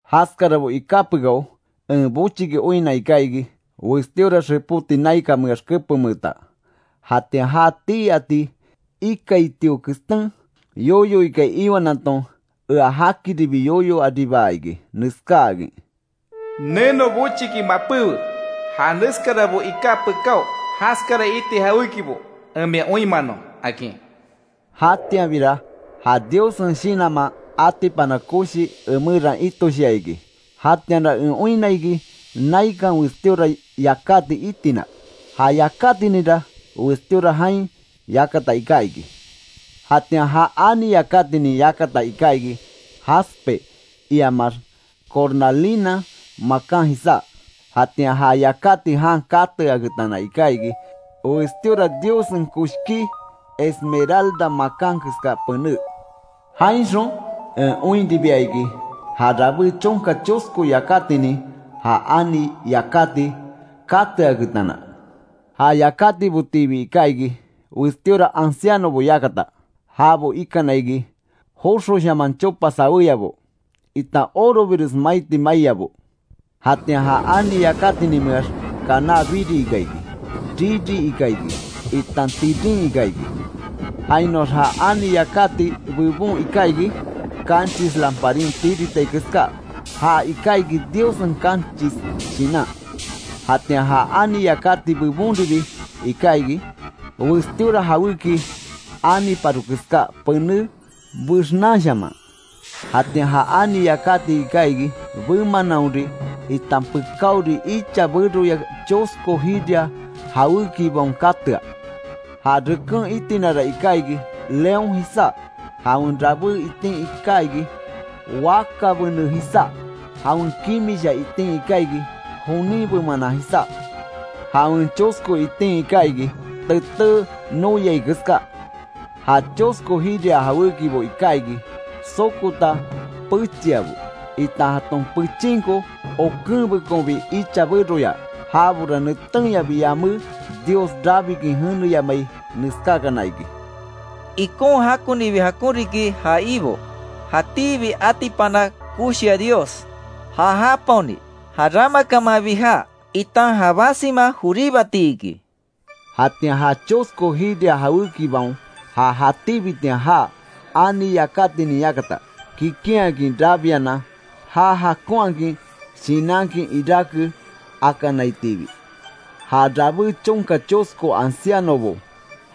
Jaskarabo iká pekáo en bochiki oinna iká iki, westíora xepóti naikanmeax kepenmeeta. Jatian ja tii ati ikaitio kestén yoyo ikai iwanaton ea jakiribi yoyo aribaa iki, neskaákin: “Neno bochiki mapéwe, ja neskarabo iká pekáo jaskara iti jawékibo en mia oinmanon”, akin. Jatianbira ja Diossen Shinanman atipana koshi emeran itoshia iki, jatianra en oinna iki naikan westíora yakáti itina; ja yakátininra westíora jain yakata iká iki. Jatian ja ani yakatinin yakata iká iki, jaspe iamax cornalina makan jisá. Jatian ja yakáti jan kateaketana iká iki, westíora Diossen koshkí, esmeralda makan keska pené. Jainxon en oinribia iki, ja rabé chonka chosko yakátinin, ja ani yakáti kateaketana. Ja yakátibotiibi iká iki, westíora ancianobo yakata. Jabo ikana iki joxoshaman chopa saweyabo, itan orobires maiti maiyabo. Jatian ja ani yakátinimeax kaná biri ika iki; riri ika iki, itan tirin iká iki. Jainoax ja ani yakati bebon iká iki, kanchis lamparin tiritai keská, ja iká iki Diossen kanchis Shinan. Jatian ja ani yakati bebonribi iká iki; westíora jawéki aniparo keská, pené bexnanshaman. Jatian ja ani yakati iká iki, bemananhori, itan pekáori icha beroya chosko jiria jawékibaon katea. Ja reken itinara iká iki, león jisá; jawen rabé itin iká iki, wakabene jisá. Jawen kimisha itin iká iki, jonin bemanan jisá. Jawen chosko itin iká iki, teté noyai keská. Ja chosko jiria jawékibo iká iki, sokota pechiabo; itan jaton pechinko okenbekonbi icha beroya. Jabora netenyabi yamé, Dios rabikin jeneyamai, neskákana iki: “¡Ikon jakonibi jakon riki ja Ibo, jatíbi atipana koshia Dios, ja japaoni, ja ramakamanbi jaa, itan ja basima joríbati!” iki. Jatian ja chosko jiria jawékibaon, ja jatíbitian jaa, ani yakatinin yakata, kikinhakin rabianan, já jakonhakin shinankin iráke akanaitiibi, ja rabé chonka chosko ancianobo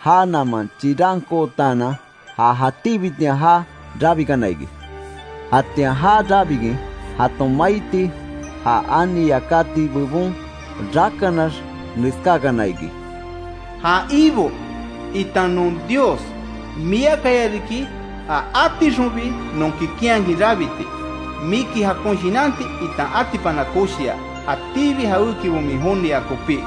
já naman, chirankootaanan ja jatíbitian jaa rabikana iki. Jatian já rabikin jaton maiti, ja ani yakati bebon rakanax neskákana iki: “Ja Ibo, itan non Dios miakaya riki ja átixonbi non kikinhakin rabiti, miki jakon shinanti, itan atipana koshia, jatíbi jawékibo min jonia kopí;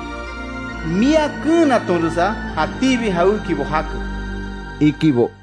mia keenatonresa jatíbi jawékibo jake”, ikibo.